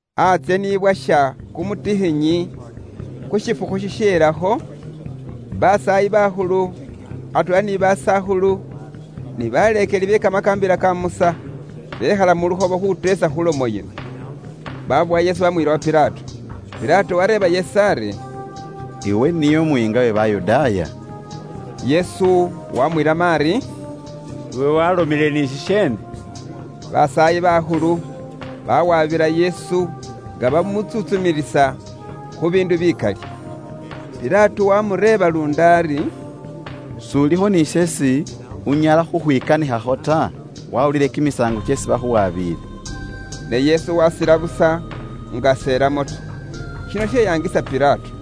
Antsye ni bwasha kumutikhinyi khu shifukhu shisheelakho, basaayi bakhulu, atweela ni basakhulu, ni baleekeli be Kamakaambila ka Musa, bekhala mu lukhobo khuteesa khu lomo yino. Babowa Yesu baamuyila wa Pilato. Pilato waareeba Yesu ari, “Iwe niye umuyiinga uwe Bayudaaya?” Yesu wamwilamo ari, “Iwe waalomile ni shisheene.” Basaayi bakhulu bawaabila Yesu nga bamutsuntsumilisa khu biindu bikali. Pilato waamureeba luundi ari, “S'ulikho ni sheesi unyala khukhwikanikhakho ta? Waawulile kimisaango kyeesi bakhuwabile.” Ne Yesu waasila busa nga s'elamo ta. Shino sheyaangisa Pilato.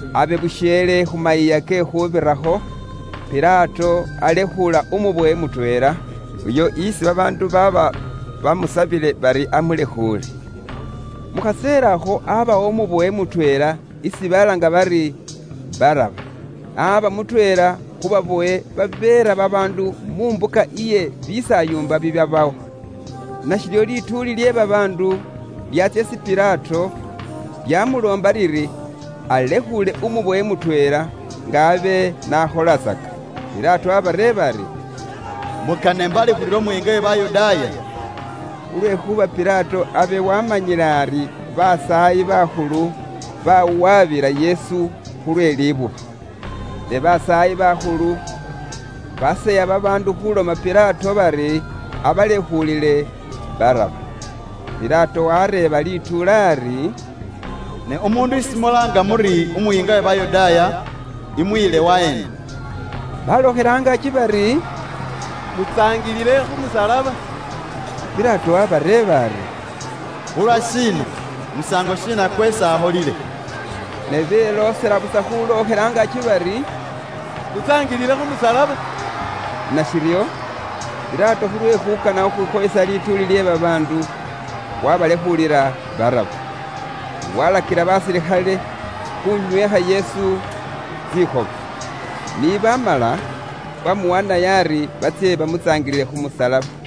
Abe busheele khu Mayiiya ke Khuubirakho, Pilato alekhuula umubowe mutweela, uyo isi babaandu baaba baamusabile bari alekhuule. Mu khaseela akho aabawo umubowe mutweela isi balaanga bari Baraba. Aaba mutweela khu babowe babeera babaandu mu mbuka iye bisaayumba bibyabawo. Nashiryo lituuli lye babaandu lyaatsya isi Pilato, lyaamuloomba liri alekhuule umubowe mutweela, nga abe n'akholatsaka. Pilato waabareeba ari, “Mukana imbalekhuulile Umuyiinga uwe Bayudaaya?” Khulwekhuuba Pilato abe waamanyile ari basaayi bakhulu bawabila Yesu khulwe libuba. Ne basaayi bakhulu baseya babaandu khuloma Pilato bari abalekhuulile Baraba. Pilato wareeba lituuli ari, “Ne umuundu isi mulaanga muri Umuyiinga uwe Bayudaaya, imuyile waheena?” Balookhela angaaki bari, “Mutsaangilile khu musalaba.” Pilato waabareeba ari, “Khulwashiina? Musaango shiina kweesi akholile?” Ne beloosela busa khulookhela angaaki bari, “Mutsaangilile khu musalaba.” Nashiryo, Pilato khulwe khuukana khukhwikhoyesa lituuli lye babaandu, wabalekhuulila Baraba. Walakila basilikhale khunywekha Yesu tsikhoba. Ni baamala, waamuwaanayo ari batsye bamutsaangilile khu musalaba.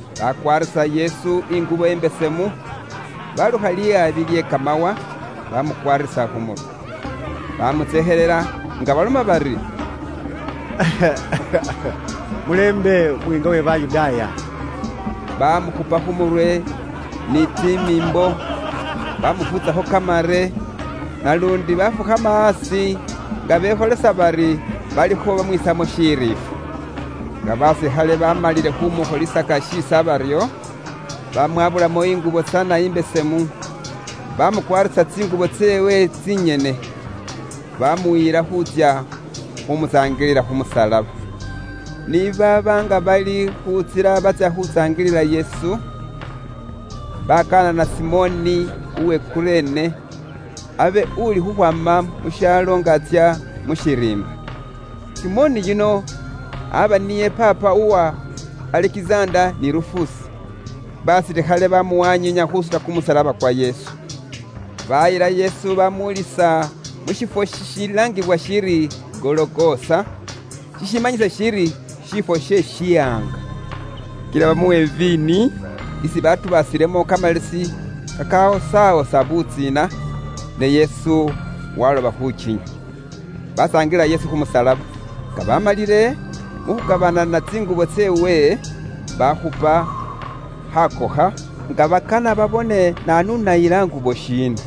Bakwaarisa Yesu ingubo imbesemu, balukha lihabi lye kamawa, bamukwaarisa khu murwe. Bamutsekhelela nga baloma bari, “Mulembe, Umuyiinga uwe Bayudaaya!” Baamukhupa khu murwe ni tsimiimbo, baamufuutsakho kamare, naluundi baafukhama aasi nga bekholisa bari balikho baamwiisamo shiriifwa. Nga basilikhale baamalile khuumukholisaka shiisa baryo, bamwabulamo ingubo tsana imbesemu, bamukwaarisa tsingubo tseewe tsinyene. Baamuyila khutsya khumutsaangilila khu musalaba. Ni baaba nga bali khu ntsila batsya khutsaangilila Yesu, bakanana Simoni uwe Kurene, abe ulikhukhwaama mu shaalo nga atsya mu shiriimba. Simoni yuno aba niye paapa uwa Alekizanda ni Rufusi. Basilikhale bamuwanyiinya khuusuta kumusalaba kwa Yesu. Baayila Yesu bamwoolisa mu shifwo shishilaangibwa shiri Gologosa, shishimanyisa shiri “Shiifwo she shihaanga.” Kila bamuwa iviini isi batubaasilemo kamalesi kakawosawosa butsiina, ne Yesu waaloba khukinywa. Batsaangilila Yesu khu musalaba. Nga bamalile, mu khukabanana tsingubo tseewe, bakhupa khakokha, nga bakana babone naanu unayila ngubo shiina.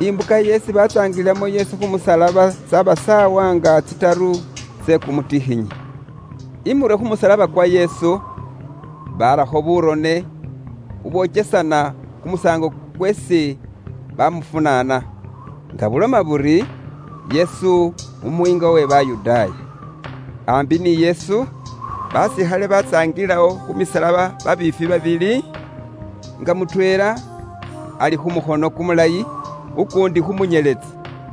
Imbuka yeesi batsaangililamo Yesu khu musalaba tsyaba saawa nga tsitaru tsye kumutikhinyi. Imurwe khu musalaba kwa Yesu barakho burone bubwokesana kumusaango kweesi bamufunaana, nga buloma buri, “Yesu Umuyiinga uwe Bayudaaya.” Aambi ni Yesu, basilikhale batsaangililawo khu misalaba babiifwi babili, nga mutweela ali khu mukhono kumulayi, ukuundi khu munyeletsi.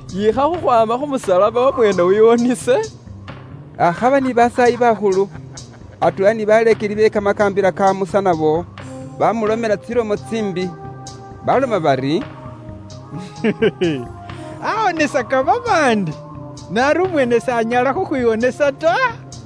Yiikha khukhwaama khu musalaba, wamweene wiwonese!” Akhaba ni basaayi bakhulu, atweela ni baleekeli be Kamakaambila ka Musa nabo bamulomela tsilomo tsiimbi. Baloma bari, “Awonesaka babaandi, ne ari umweene s'anyala khukhwiwonesa ta.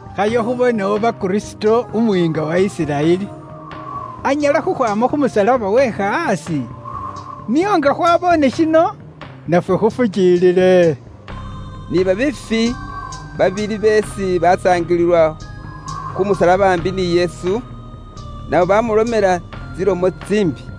Khayo khubone oba Kristo, Umuyiinga uwa Isiraeli, anyala khukhwaama khu musalaba wekha aasi. Nio nga khwaboone shino nafwe khufukiilile.” Ni babeefwi babili beesi batsaangilila khu musalaba aambi ni Yesu, nabo baamulomela tsilomo tsiimbi.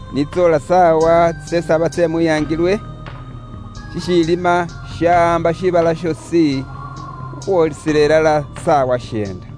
Ni tsoola saawa tsisesaba tsye mwihangilwe, shishiilima shawaamba shiibala shoosi, khukhwoolisila ilala saawa sheenda.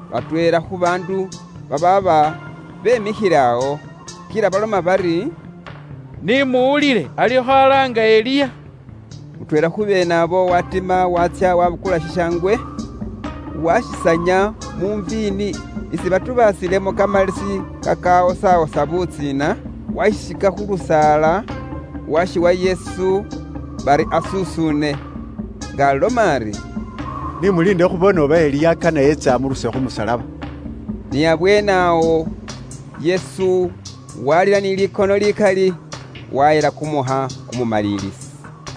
Batweela khu baandu babaaba bemikhile awo, kila baloma bari, “Ni muwulile, alikho alaanga Eliya.” Mutweela khu beene abo watima waatsya wabukula shishangwe, washisanya mu viini isi batubaasilemo kamalesi kakawosawosa butsiina, washisika khu lusaala washiwa Yesu bari asusuune, nga aloma ari, “Ni muliinde khubone oba Eliya kane etse amuruse khu musalaba.” Ni abweene awo, Yesu walila ni likono likali, wahela kumuukha kumumalilisi.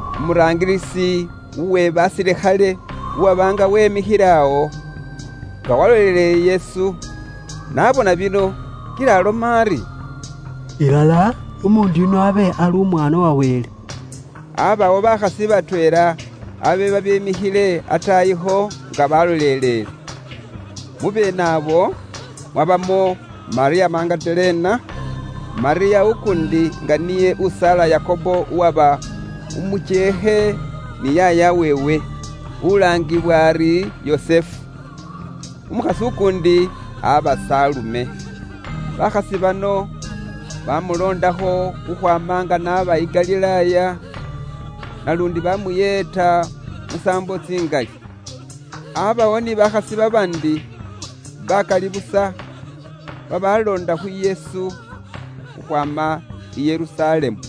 Umuraangilisi uwe basilikhale uwaba nga wemikhile awo, nga walolelele Yesu, n'abona bino kila aloma ari, “Ilala, umuundu yuno abe ali Umwaana wa Wele!” Aabawo bakhasi batweela abe babemikhile ataayikho nga balolelele. Mu beene abo mwabamo Malyamu Magadalena, Malyamu ukuundi nga niye usaala Yakobo uwaba umukyeekhe ni yaaya weewe, ulaangibwa ari Yosese. Umukhasi ukuundi aba Salume. Bakhasi bano baamuloondakho khukhwaama nga n'aba i Galilaaya, naluundi baamuyeeta musaambo tsingali. Aabawo ni bakhasi babaandi bakali busa babaaloonda khu Yesu khukhwaama i Yerusalemu.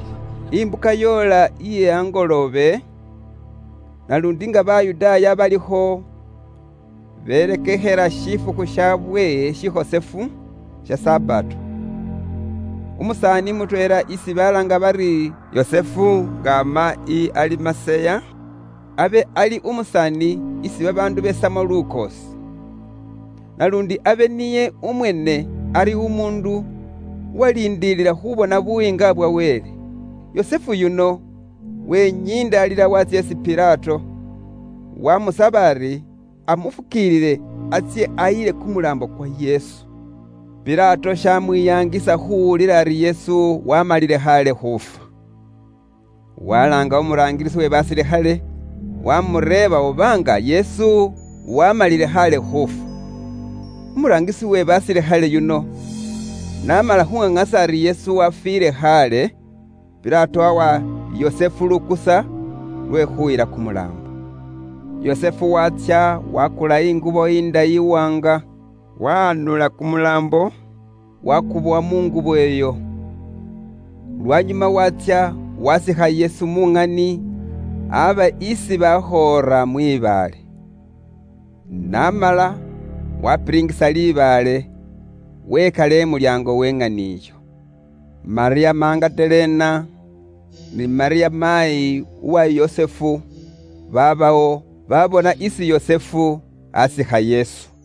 Imbuka yoola iye angoloobe, naluundi nga Bayudaaya balikho berekekhela shifukhu shabwe shikhosefu, sha Sabato. Umusaani mutweela isi balaanga bari Yusufu nga ama i Alimaseya, abe ali umusaani isi babaandu besamo lukoosi. Naluundi abe niye umweene ali umuundu uwaliindilila khubona Buyiinga bwa Wele. Yusufu yuno wenyindaalila waatsya isi Pilato, wamusaba ari amufukiilile atsye ayile kumulaambo kwa Yesu. Pilato shamwiyangisa khuwulila ari Yesu waamalile khaale khufwa. Walaanga umuraangilisi we basilikhale, wamureeba oba nga Yesu waamalile khaale khufwa. Umuraangilisi we basilikhale yuno n'amala khuŋaŋasa ari Yesu wafwiile khaale, Pilato wawa Yusufu lukusa lwe khuyila kumulaambo. Yusufu waatsya wakula ingubo indayi iwaanga, wahanula kumulaambo wakubowa mu ngubo iyo. Lwanyuma waatsya wasiikha Yesu mu ŋani abe isi bakhoora mwibaale. N'amala, wapilingisa libaale, wekala imulyaango we ŋani iyo. Malyamu Magadalena ni Malyamu maayi uwa Yosese baabawo, babona isi Yusufu asiikha Yesu.